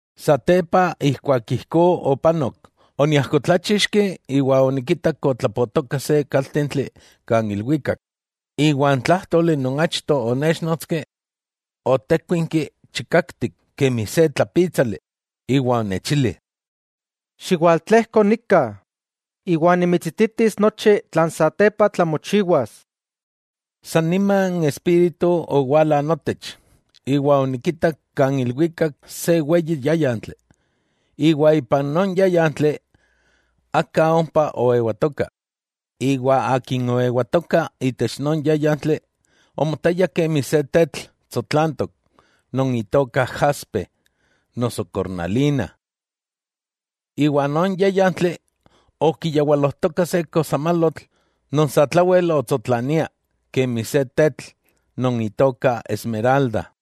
Satepa ijkuak ijkó opanok, oniajkotlachixki iwa onikitak otlapotoka se kaltentli kan ilwikak, iwa n tlájtoli non achto onéchnotski, otékuinki chikaktik kemi se tlapítsali, iwa onechili: —Xiwaltlejko nika, iwa nimitsititis nochi tlan satepa tlamochiwas. San nima n Espíritu owala notech, iwa onikitak kan ilwikak se weyi yáyantli, iwa ipan non yáyantli aka ompa oewatoka. Iwa akin oewatoka itech non yáyantli, omotaya kemi se tetl tsotlantok non itoka jaspe noso kornalina. Iwa non yáyantli okiyawalojtoka se kosamalotl non satlawel otsotlania kemi se tetl non itoka esmeralda.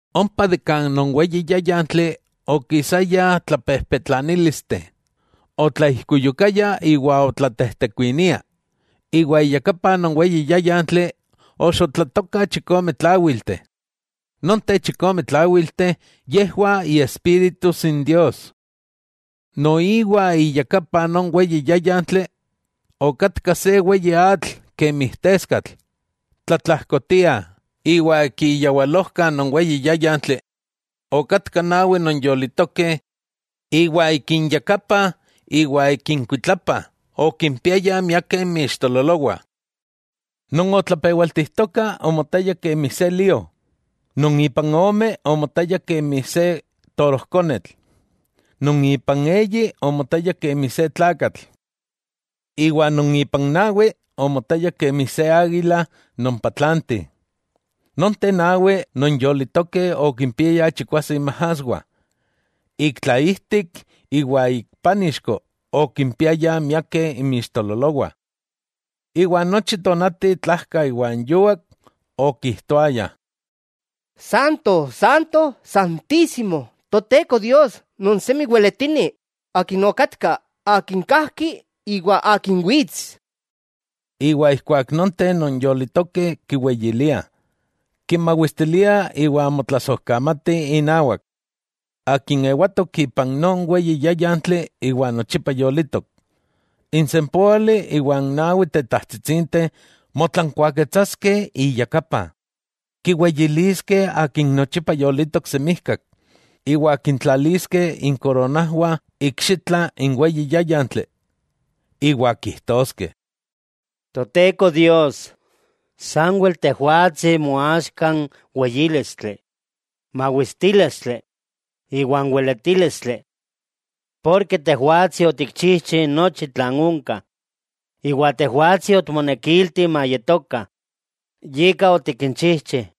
Ompa de kan non weyi yáyantli okisaya tlapejpetlanílisteh, otlaijkuyukaya iwa otlatejtekuinia, iwa iyakapa non weyi yáyantli oxotlatokah chikome tláwilteh. Nonteh chikome tláwilteh, yejwah Iespíritus n Dios. Noiwa iyakapa non weyi yáyantli okatka se weyi atl kemi teskatl. Tlatlajkotia, iwa ik iyawalojka non weyi yáyantli, okatkah nawi non yolitokeh iwa ik inyakapah iwa ik inkuitlapa okimpiayah miakeh inmixtololowah. Non otlapewaltijtoka omotaya kemi se lío; non ipan ome omotaya kemi se torojkonetl; non ipan eyi omotaya kemi se tlakatl; iwa non ipan nawi, omotaya kemi se águila non patlanti. Nonteh nawi non yolitokeh okimpiayah chikwase inmajaswah, ik tlaijtik iwa ik pánixko okimpiayah miakeh inmixtololowah. Iwa nochi tonati tlajka iwa n yuak okijtoayah: ¡Santo, Santo, Santísimo, Toteko Dios non semi weletini, Akin okatka, Akin kajki iwa Akin wits! Iwa ijkuak nonteh non yolitokeh kiweyiliah, kimawistiliah iwa motlasojkamatih inawak, Akin ewatok ipan non weyi yáyantli iwa nochipa yolitok. N sempóali iwa n nawi tetajtsitsinteh motlankuaketsaskeh iyakapa, kiweyiliskeh Akin nochipa yolitok semijkak, iwa kintlaliskeh inkoronajwah ikxitla n weyi yáyantli, iwa kijtoskeh: Toteko Dios, sanwel Tejwatsi moaxka n weyílistli, mawistílistli iwa n weletílistli. Porke Tejwatsi otikchijchi nochi tlan onka, iwa tejwatsi otikmonekilti mayetokah, yika otikinchijchi.